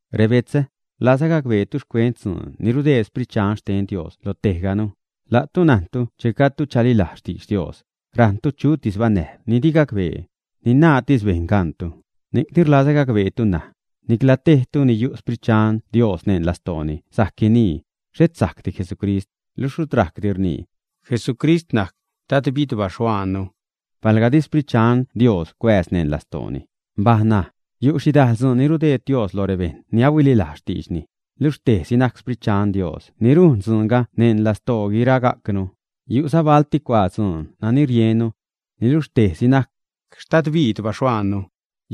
Rebetzä, rlazä gacbeetu xcuent dzuun ni rudeed Sprit Dxan xten Dios lo tejganu. La'tu najntu che gajdtu chalilajz xtidx Dios, rajṉtu chutis banäjb ni di gacbee, ni naatis bejṉ gaṉtu. Ni'cni rlazä gacbeetu ṉaj, nicla tejtu ni yu' Xsprit Dxan Dios neṉ lastooni sajc guinii: “Xhet sajcdi Jesucrist.” Luxh rut rajcdi rnii: “Jesucrist najc Dadbid baxhuaannu”, palga di Xprit Dxan Dios cuääz neṉ lastooni. Mbaj ṉaj. Yu' xhidajl dzuun ni rudeed Dios loj rebejṉ ni huililajz xtiidxni, niluxh tejsi najc Xsprit Dxan Dios ni rujn dzuunga neṉ lastoo guiragajcnu. Yu'za balti cuaa dzuun nani riennu, niluxh tejsi najc Xtadbid baxhuaannu.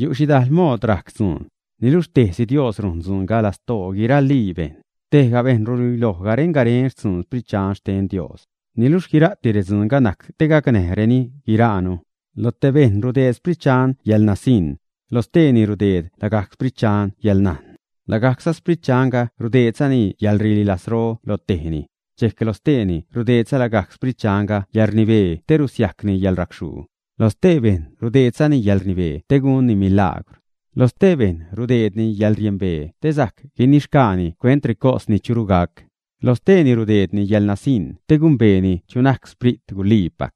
Yu' xhidajl mood rajc dzuun, niluxh tejsi Dios rujn dzuunga lastoo guiralii bejṉ. Tejga bejṉ ruluiloj garen-garen xtzuun Sprit Dxan xten Dios, niluxh guira'ti redzuunga najc te gacnäjreni guiraanu. Lo tej bejṉ rudeed Sprit Dxan yäḻnasiṉ, lo steeni rudeed lagajc Sprit Dxanga yäḻnajn. Lagajcza Sprit Dxanga rudeedzani yäḻrililajzro lo tejni, dxejc lo steeni rudeedza lagajc Sprit Dxanga yäḻrnibee te rusiajcni yäḻracxhuu. Loj stee bejṉ rudeedzani yäḻrnibee te gunni milaagwr, loj stee bejṉ rudeedni yäḻriembee te sajc guinixgaani xcuent recos ni churu gac; lo steeni rudeedni yäḻnasiṉ te gumbeeni chu najc Sprit guliipac,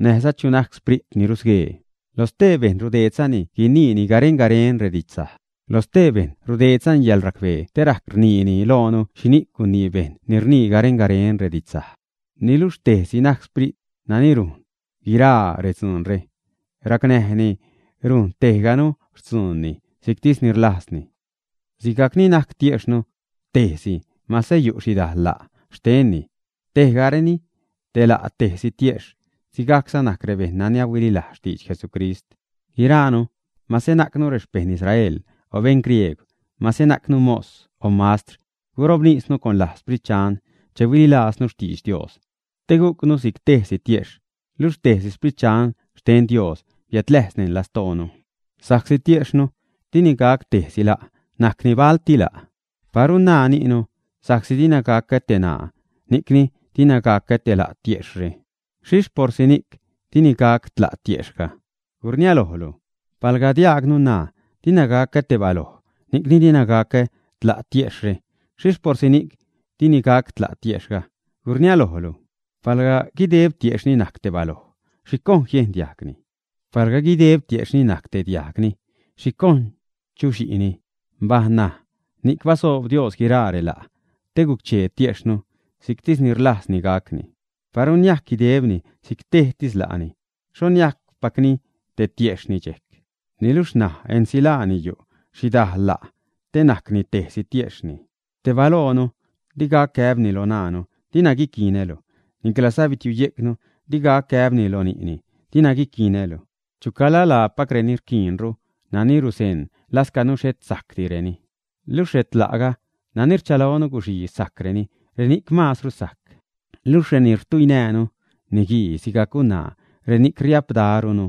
näjza chu najc sprit ni rusguee. Lo stee bejṉ rudeedzani guiniini garen-garen redidxsaj; loj stee bejṉ rudeedzani yäḻracbee te rajc rniini loonu xhini'c gunii bejṉ ni rnii garen-garen redidxsaj. Niluxh tejsi najc Sprit nani rujn guiraa redzuunre, racnäjni rujn tejganu xtzuunni si'ctis ni rlajzni. Sigajc ni najc tiejxhnu tejsi, mase yu' xhidajl la' xtenni, tejgareni te la' tejsi tiejxh, sigajcza najc rebejṉ nani huililajz xtidx Jesucrist. Guiraanu, mase najcnu rexpejṉ Israel o beṉ griegw, mase najcnu mos o mastr, gurobnisnu con laj Sprit Dxan che huililajznu xtidx Dios, te gujcnu si'c tejsi tiejxh, luxh tejsi Sprit Dxan xten Dios biädläjz neṉ lastoonu. Sa'csi tiejxhnu dini gac tejsi la', najcni balti la'. Paru naa ni'nu: “Sa'csi dina gacä te ṉaa, ni'cni dina gacä te la' tiejxhre.” ¿Xhixh porsi ni'c dini gac tla' tiejxhga, ä? ¡Gurniälojlu! Palga diajgnu naa: “Dina gacä te baloj, ni'cni dina gacä te la' tiejxhre.” ¿Xhixh porsi ni'c dini gac tla' tiejxhga, ä? ¡Gurniälojlu! Palga guideb tiejxhni niajc te baloj, ¿xhi cojn niejn diajgni? Palga guideb tiejxhni niajc te diajgni, ¿xhi cojn chuxhi'ni? Mbaj ṉaj, ni'c basoob Dios guiraa rela' te guc-chee tiejxhnu si'ctis ni rlajzni gacni. Paru niajc guidebni si'c tejtis la'ni, ¿xho niajcpacni te tiejxhni dxejc? Niluxh ṉaj ensilaani yu' xhidajl la' te najcni tejsi tiejxhni. Te balojnu di gac gäbni lo ṉaanu: “Dina guiquinälu”, niclaza bitiuyejcni di gac gäbni lo ni'ni: “Dina guiquinälu.” Chucala lapacreni rquiinru nani ruzeṉ lascanu xhet sajcdireni. Luxh retla'ga nani rchalonu guxii sajcreni, reni'c maazru sajc. Luxh reni rtuinäänu, niguii sigajc gunaa, reni'c riapdarunu.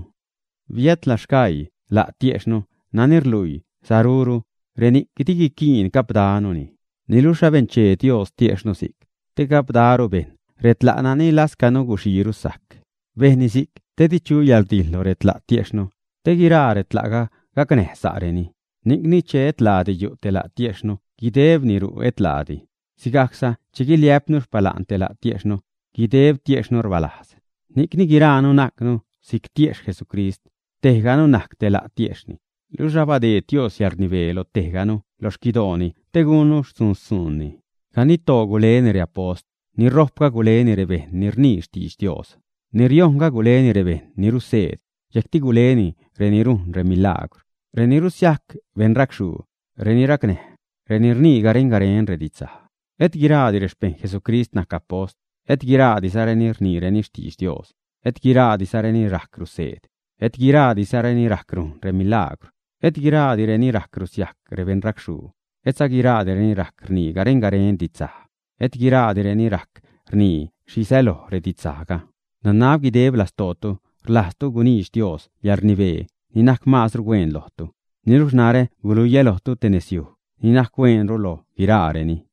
Biätla sgaii la' tiejxhnu nani rlui saruru, reni'c di guiquiin gapdanuni. Niluxh abenchee Dios tiejxhnu si'c, te gapdaru bejṉ retla' nani lascanu guxiiru sajc. Bejnni si'c te di chu yäḻrdijḻ lo retla' tiejxhnu, te guiraa retla'ga gacnäj sa'reni. Ni'cni che et laadi yu' te la' tiejxhnu guidebni ru' et laadi. Sigajcza che guiliä'pnu xpala'n te la' tiejxhnu, guideb tiejxhnu rbalajz. Ni'cni guiraanu najcnu si'c tiejxh Jesucrist. Tejganu najc te la' tiejxhni. Luxh abadeed Dios yäḻrnibee lo tejganu lo xquidooni te gunnu xtzuun-xtzuunni. Ganidtoo guleni reapost; ni ṟojpga guleni rebejṉ ni rnii xtidx Dios; ni riojṉga, guleni rebejṉ ni ruseed; dxejcti guleni reni rujn remilagwr, reni rusiajc beṉracxhuu, reni racnäj, reni rnii garen-garen redidxsaj. Et guiraadi rexpejṉ Jesucrist najc apost. Et guiraadizareni rniireni xtidx Dios. Et guiraadireni rajc ruseed. Et guiraadizareni rajc rujn remilagwr. Et guiraadireni rajc rusiajc rebeṉracxhuu. Etza guiraadireni rajc rnii garen-garen didxsaj, et guiraadireni rajc rnii xhi säloj redidxsajga. Nanab guideb lastootu rlajztu guniidx Dios reyäḻrnibee ni najc maazru hueen lojtu. Niluxh narä guluiä lojtu te nezyuj ni najc hueenru loj guiraareni.